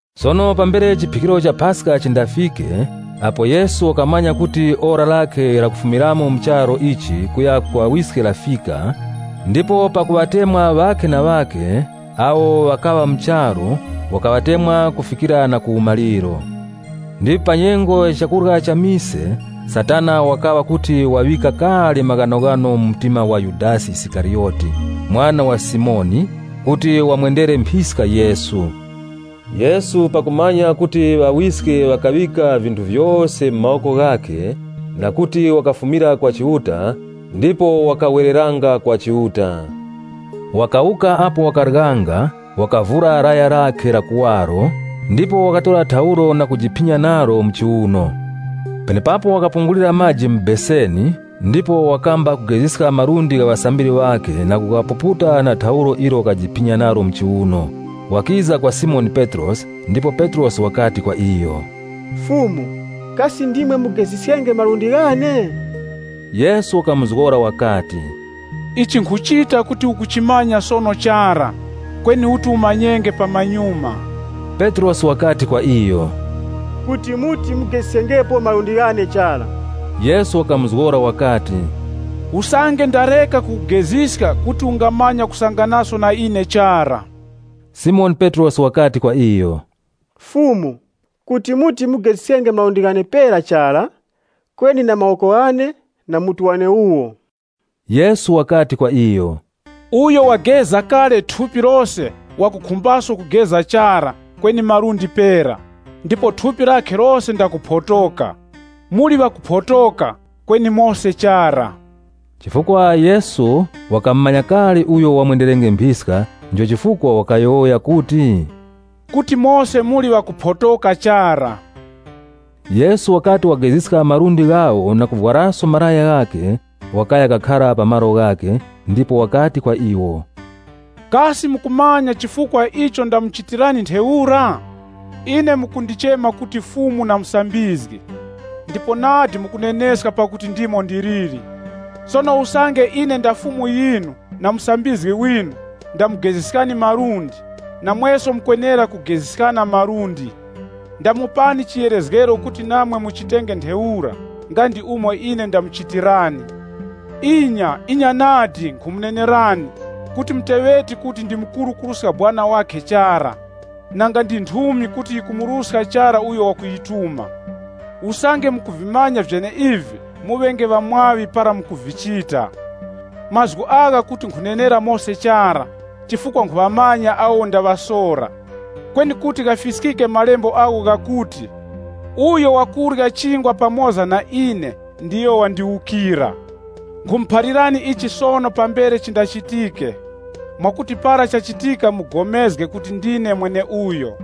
Sono pambere chiphikiro cha Paska chindafike, apo Yesu wakamanya kuti ora lakhe la kufumiramo mu charu ichi kuya ku Ŵawiske lafika, ndipo pakuŵatemwa ŵakhe na ŵakhe awo ŵakaŵa mu charu, wakaŵatemwa kufikira na ku umaliro. Ndipo pa nyengo ya chakurya cha mise, Satana wakawa kuti waŵika kale maghanoghano mu mtima wa Yudasi Isikariyoti, mwana wa Simoni, kuti wamwendere mphiska Yesu. Yesu pakumanya kuti Ŵawiske ŵakaŵika vinthu vyose mu mawoko ghakhe, na kuti wakafumira kwa Chiuta, ndipo wakawereranga kwa Chiuta, wakawuka apo wakaryanga, wakavura laya lakhe la kuwaro, ndipo wakatora thaulo na kujiphinya nalo mu chiuno. Penepapo wakapungulira maji mu beseni ndipo wakamba kugeziska malundi gha ŵasambiri ŵakhe na kughapuputa na thaulo ilo wakajiphinya nalo mu chiuno. Wakiza kwa Simoni Petrosi ndipo Petrosi wakati kwa iyo, “Fumu, kasi ndimwe mugeziskenge malundi ghane?” Yesu wakamuzgora wakati, “Ichi nkhuchita kuti ukuchimanya sono chara, kweni uti umanyenge pamanyuma.” Petrosi wakati kwa iyo, “Kuti muti mugeziskengepo malundi ghane chara!” Yesu wakamuzgora wakati, “Usange ndareka kukugeziska kuti ungamanya kusanganaso na ine chara.” Simoni Petrosi wakati kwa iyo, “Fumu, kuti muti mugeziskenge malundi ghane pera chara, kweni na mawoko ghane na mutu wane wuwo.” Yesu wakati kwa iyo, “Uyo wageza kale thupi lose wakukhumbaso kugeza chara kweni malundi pera, ndipo thupi lakhe lose ndakuphotoka. Muli ŵakuphotoka, kweni mose chara.” Chifukwa Yesu wakamumanya kale uyo wamwenderenge mphiska, ndicho chifukwa wakayowoya kuti, “Kuti mose muli ŵakuphotoka chara.” Yesu wakati wageziska malundi ghawo na kuvwaraso malaya ghakhe, wakaya kakhara pa malo ghakhe, ndipo wakati kwa iwo, Kasi mukumanya chifukwa icho ndamuchitirani ntheura? Ine mukundichema kuti Fumu na Musambizgi, ndipo nadi mukuneneska pakuti ndimo ndiliri. Sono usange ine nda Fumu yinu, na Musambizgi winu, ndamugeziskani malundi, namweso mukwenera kugeziskana malundi. Ndamupani chiyerezgero kuti namwe muchitenge ntheura nga ndi umo ine ndamuchitirani. Inya, inya nadi, nkhumunenerani kuti muteŵeti kuti ndi mukuru kuruska sekuru wakhe chara, nanga ndi nthumi kuti yikumuruska chara uyo wakuyituma. Usange mukuvimanya vyeneivi muŵenge ŵakutumbika usange mukuvichita! “Mazgu agha kuti nkhunenera mose chara, chifukwa nkhuŵamanya awo ndaŵasora. Kweni kuti ghafiskike Malembo agho ghakuti, ‘Uyo wakurya chingwa pamoza na ine ndiyo wandiwukira.’ Nkhumuphalirani ichi sono pambere chindachitike, mwakuti para chachitika mupulikane kuti ndine mweneuyo.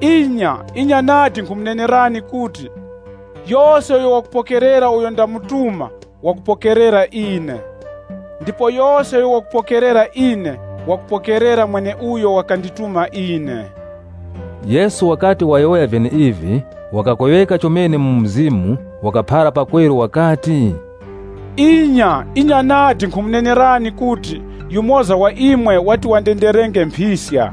Inya, inya nadi nkhumunenerani kuti, yose uyo wakupokerera uyo ndamutuma wakupokerera ine. Ndipo yose uyo wakupokerera ine wakupokerera mweneuyo wakandituma ine.” Yesu wakati wayowoya vyeneivi, wakakweŵeka chomene mu mzimu wakaphara pakweru wakati, “Inya, inya nadi nkhumunenerani kuti, yumoza wa imwe wati wandenderenge mphiska.”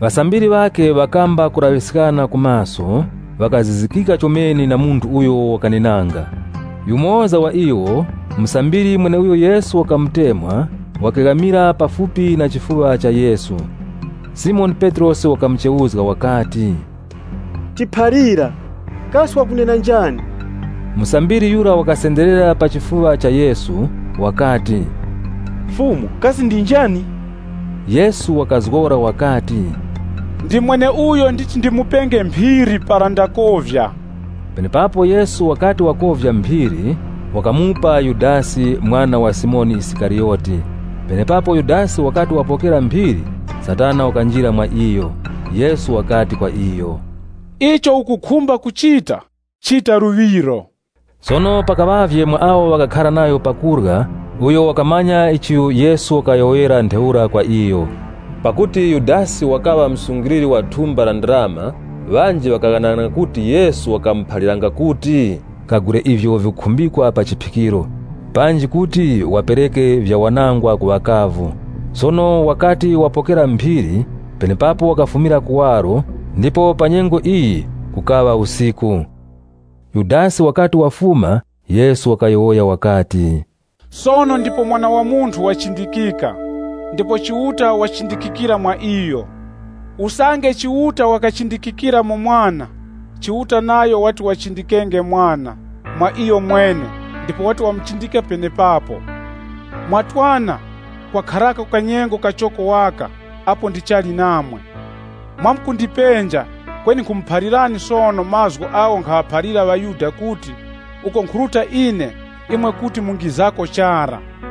Ŵasambiri ŵakhe ŵakamba kulaŵiskana ku maso, ŵakazizikika chomene na munthu uyo wakanenanga. Yumoza wa iwo, musambiri mweneuyo Yesu wakamutemwa wakeghamira pafupi na chifuŵa cha Yesu. Simoni Petrosi wakamuchewuzga wakati, “Tiphalira kasi wakunena njani?” Musambiri yura wakasenderera pa chifuŵa cha Yesu, wakati, “Fumu, kasi ndi njani?” Yesu wakazgora wakati, “Ndi mweneuyo nditi ndimupenge mphiri para ndakovya.” Penepapo Yesu wakati wakovya phiri, wakamupa Yudasi mwana wa Simoni Isikariyoti. Penepapo Yudasi wakati wapokera phiri, Satana wakanjira mwa iyo. Yesu wakati kwa iyo, “Icho ukukhumba kuchita, chita luŵiro.” Sono pakaŵavye mwa awo ŵakakhara pa kurya, uyo wakamanya chifukwa icho Yesu wakayowoyera ntheura kwa iyo. Pakuti Yudasi wakaŵa msungiliri wa thumba la ndarama, ŵanji ŵakaghanaghananga kuti Yesu wakamuphaliranga kuti, “Kagule ivyo vikukhumbikwa pa chiphikiro,” panji kuti wakapereke vyawanangwa ku ŵakavu. Sono wakati wapokera phiri, penepapo wakafumira kuwaro, ndipo panyengo iyi kukaŵa usiku. Yudasi wakati wafuma, Yesu wakayowoya wakati, “Sono ndipo Mwana wa Munthu wachindikika, ndipo Chiuta wachindikikira mwa iyo. Usange Chiuta wakachindikikira mu Mwana, Chiuta nayo wati wachindikenge Mwana mwa iyomwene ndipo wati wamuchindike penepapo. Mwa twana, kwakharako kanyengo kachoko waka apo ndichali namwe. Mwamkundipenja, kweni nkhumuphalirani sono mazgu agho nkhaŵaphalira ŵaYuda kuti, ‘Uko nkhuruta ine, imwe kuti mungizako chara.’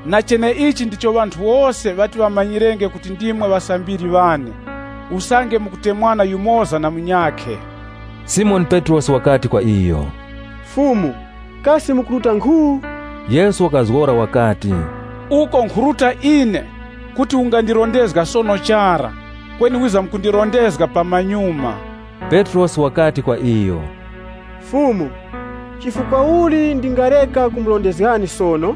Na cheneichi ndicho ŵanthu wose ŵati ŵamanyirenge kuti ndimwe ŵasambiri ŵane, usange mukutemwana yumoza na munyakhe.” Simoni Petrosi wakati kwa iyo, “Fumu, kasi mukuruta nkhu?” Yesu wakazgora wakati, “Uko nkhuruta ine, kuti ungandirondezga sono chara, kweni wizamkundirondezga pamanyuma.” Petrosi wakati kwa iyo, “Fumu, chifukwa uli ndingareka kumurondezgani sono?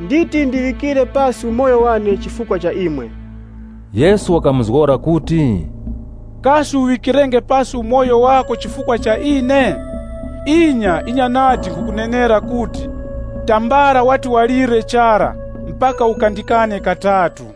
Nditi ndiŵikire pasi umoyo wane chifukwa cha imwe.” Yesu wakamuzgora kuti, Kasi uŵikirenge pasi umoyo wako chifukwa cha ine? Inya, inya nadi nkhukunenera kuti, tambala wati walire chara, mpaka ukandikane katatu.